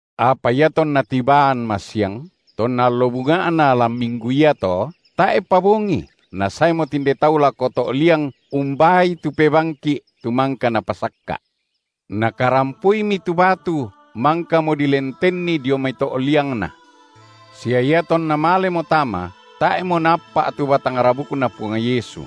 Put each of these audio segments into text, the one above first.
Apa iatonna tibaan masiang, tonna allo bunga’na lan minggu iato, tae’pa bongi, nasaemo tinde tau lako to’ liang umbaai tu pebangki’ tu mangka napasakka’. Nakarampoimi tu batu mangkamo dilentenni dio mai to’ liangNa, sia iatonna malemo tama, tae’mo naappa’ tu batang rabukNa Puang Yesu.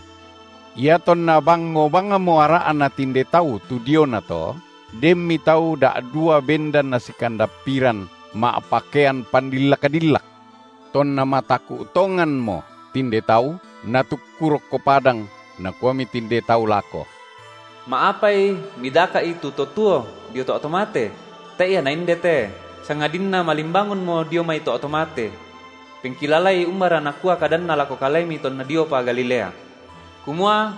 Iatonna bangngo bangmo ara’na tinde tau tu diona to, denmi tau da’dua bendan nasikandappiran, ma’pakean pandillak-dillak. Tonna mataku’ tonganmo tinde tau natukku rokko padang, nakuami tinde tau lako: Ma’apai midaka’I tu To tuo dio to’ to mate? Tae’ Ia Naindete, sangadinna malimbangunmo dio mai to’ to mate. Pengkilalai umbara nakua kadanNa lako kalemi tonna diopa Galilea, kumua: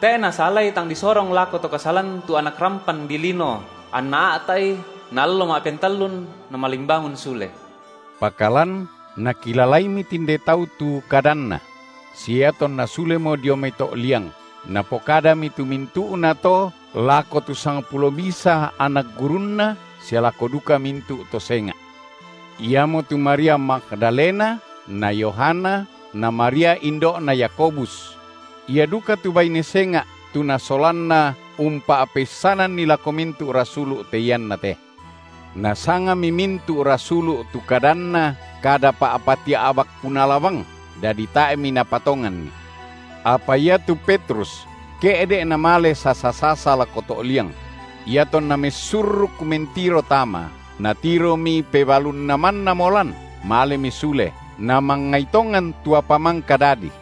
Tae’ nasalai tang disorong lako to kasalan tu Anak rampan dilino anna a’ta’I naallo ma’pentallun Namalimbangun sule. Pakalan nakilalaimi tinde tau tu kadanNa; sia iatonna sulemo dio mai to’ liang, napokadami tu mintu’na to lako tu sangpulo misa anak gurunNa sia lako duka mintu’ to senga’. Iamotu Maria Magdalena na Yohana na Maria indo’na Yakobus; ia duka tu baine senga’, tu nasolanna, umpa’peissananni lako mintu’ rasulu’ te ianna te. Nasangami mintu’ rasulu’ tu kadanna kada pa’patia’bak punala bang, dadi tae’mi napatonganni. Apa iatu Petrus ke’de’ namale sasa-sasa lako to’ liang; iatonna messurruk mentiro tama, natiromi pebalunNa mannamo lan, malemi sule, namangngai tongan tu apa mangka dadi.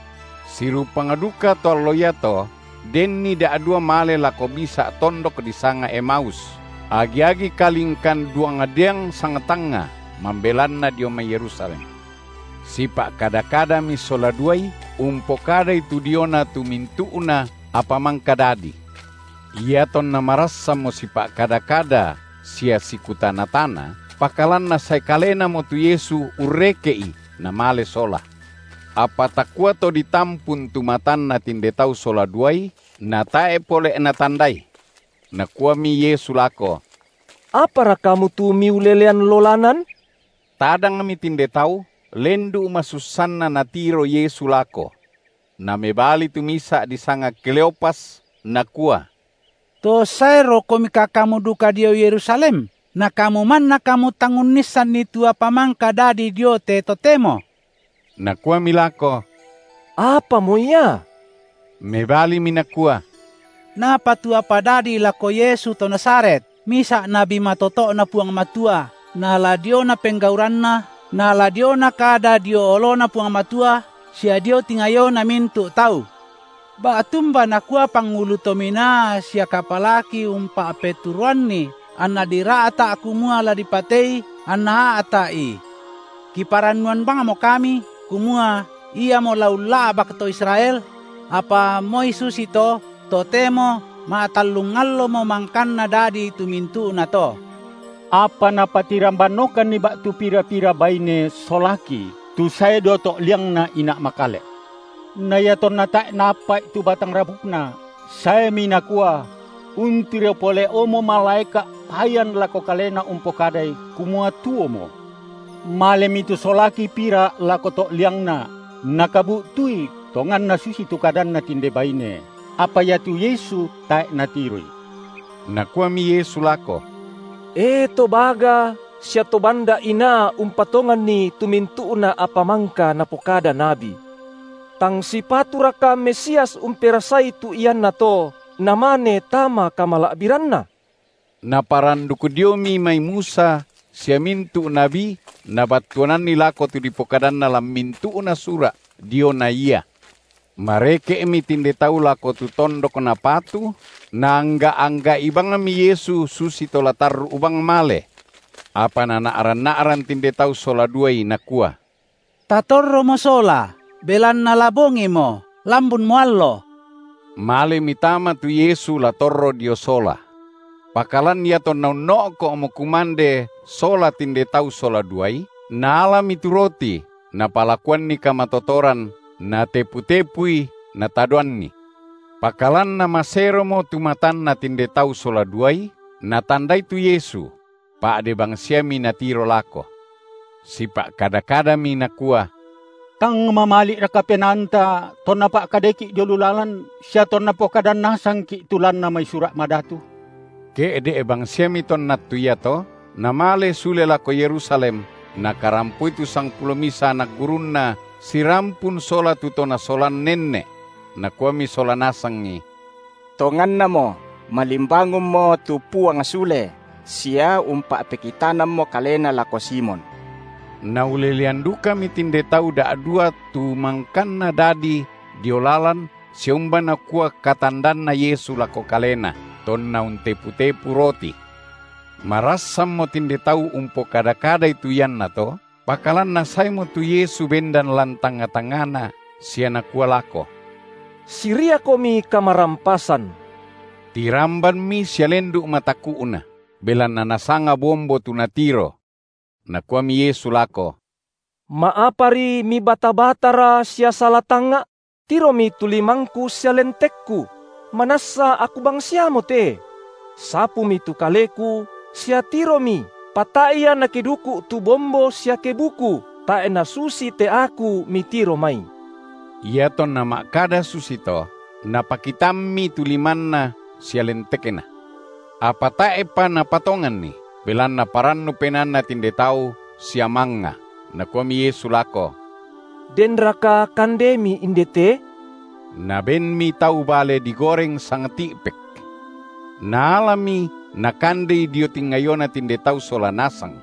Sirupang dukato allo iato denni da’duai male lako misa’ tondok disanga Emaus, agi-agi kalingkan duang diang sangtangnga mambelanna dio mai Yerusalem. Sipa’kada-kadami sola duai umpokadai tu diona tu mintu’na apa mangka dadi. Iatonna marassanmo sipa’kada-kada sia sikutana-tana, pakalan Nasae kaleNamo tu Yesu urreke’i, Namale sola, apa takua to ditampun tu matanna tinde tau sola duai, natae’ pole’ natandai. Nakuami Yesu lako: Apara kamu tu miulelean lolanan? Tadangmi tinde tau, lendu’ masussanna Natiro Yesu lako. Namebali tu misa’ disanga Kleopas, nakua: To saeroKomika Kamu duka dio Yerusalem, na Kamu manna Kamu tang unnissanni tu apa mangka dadi dio te totemo? Nakuami lako: Apamo ia? Mebalimi nakua: Napa tu apa dadi lako Yesu to Nazaret, misa’ nabi matoto’Na Puang Matua nala diona penggauranNa, nala diona kada dio oloNa Puang Matua sia dio tingayona mintu’ tau; ba’tumba nakua pangulu to minaa sia kapalaki umpa’peturoanNi, anna dira’ta’ kumua la dipatei, anna a’ta’I! Kiparannuan bangmo kami, kumua Iamo la ulla’bak to Israel, – apa moi susito, totemo ma’tallung allomo mangkanna dadi tu mintu’nato. Apa napatirambanokanni ba’tu pira-pira baine solaki, tu sae dio to’liangNa ina’ makale’; na iatonna tae’ naappa’i tu batang rabukNa, saemi nakua: untiro pole’omo malaeka’ payan lako kalena umpokadai, kumua tuomo. Malemi tu solaki pira lako to’ liangNa, nakabu’tui tonganna susitu kadanNa tinde baine, apa iatu Yesu tae’ natiroI. Nakuami Yesu lako: E to baga sia to banda’ inaa umpatonganni tu mintu’na apa mangka napokada nabi! Tang sipaturaka Mesias umperasai tu iannato, Namane tama kamala’biranNa? Naparanduk diomi mai Musa sia mintu’ nabi Nabattuananni lako tu dipokadanna lan mintu’na sura’ diona Ia. Mareke’mi tinde tau lako tu tondok napatu, Naangga’-angga’i bangmi Yesu susito la tarru’ bang male. Apa nana’ran-na’ran tinde tau sola duai, nakua: Tatorromo sola, belanna la bongimo, lambunmo allo. Malemi tama tu Yesu la torro dio sola. Pakalan iatonna unno’ko’mo kumande sola tinde tau sola duai, Naalami tu roti, Napalakuanni kamatotoran, Natepu-tepui, Natadoanni. Pakalan namaseromo tu matanna tinde tau sola duai, natandai tu Yesu; pa’de bangsiami natiro lako. Sipa’kada-kadami, nakua: Tang mamali’raka penaanta, tonNa pa’kadaiki’ dio lu lalan sia tonna pokadan nasangki’ tu lanna mai Sura’ Madatu? Ke’de’ bangsiami tonna attu iato, namale sule lako Yerusalem, nakarampoi tu sangpulo misa anak gurunNa sirampun sola tu to nasolan nenne’; nakuami sola nasangi: Tongannamo malimbangunmo tu Puang sule sia umpa’pekitanammo Kalena lako Simon. Naulelean dukami tinde tau da’dua tu mangkanna dadi dio lalan sia umba nakua katandanna Yesu lako kalena, tonna untepu-tepu roti. Marassanmo tinde tau umpokada-kadai tu iannato, pakalan Nasaemo tu Yesu bendan lan tangnga-tangngana sia Nakua lako: Siriakomi kamarampasan. Tirambanmi sia lendu’ mataku’na, belanna nasanga bombo tu natiro. Nakuami Yesu lako: Ma’apari mibata-batara sia sala tangnga’? Tiromi tu limangKu sia lentekKu, manassa Aku bangsiamote! Sapumi tu Kaleku, sia tiromi, pa tae’ ia nakeduku’ tu bombo sia kebuku, tae’ nasusi te Aku mitiro mai. Iatonna ma’kada susito, Napakitammi tu limanNa sia lentekNa. Apa tae’pa napatonganni, belanna parannu penaanna tinde tau sia mangnga, Nakuami Yesu lako: Denraka kandemi indete? Nabenmi tau bale digoreng sangti’- pek. Naalami Nakandei dio tingayona tinde tau sola nasang.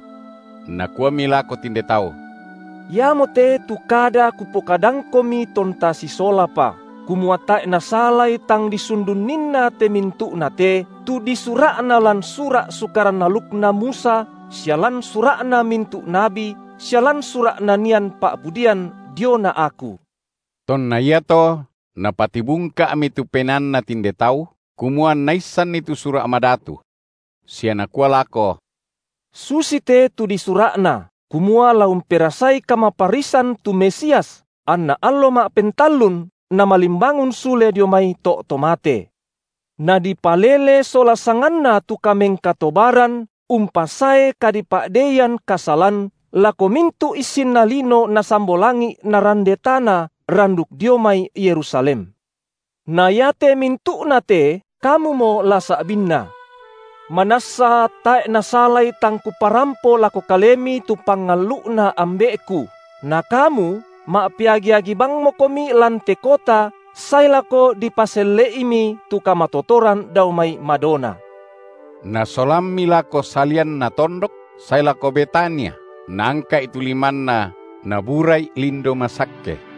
Nakuami lako tinde tau: Iamote tu kada KupokadangKomi tonta sisolapa, kumua tae’ nasalai tang disundunninna te mintu’nate, tu disura’na lan sura’ Sukaran alukna Musa sia lan sura’na mintu’ nabi sia lan sura’ nanian pa’pudian diona Aku. Tonna iato Napatibungka’mi tu penaanna tinde tau, kumua anna issanni tu Sura’ Madatu. Sia Nakua lako: susite tu disura’na, kumua la umperasai kamaparrisan tu Mesias, anna allo ma’pentallun Namalimbangun sule dio mai to’ to mate, nadipalele sola sanganNa tu kamengkatobaran umpasae kadipa’deian kasalan lako mintu’ issinna lino nasambo langi’ narande tana, randuk dio mai Yerusalem. Na iate mintu’na te kamumo la sa’binna. Manassa tae’ nasalai tang Kuparampo lako kalemi tu pangallu’Na Ambe’Ku, na kamu ma’peagi-agi bangmokomi lan te kota sae lako dipaselle’imi tu kamatotoran dao mai madona. Nasolammi lako salianna tondok sae lako Betania, Naangka’i tu limanNa, Nabura’i lindo masakke.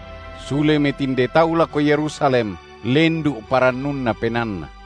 Sulemi tinde tau lako Yerusalem lendu’ parannunna penaanna.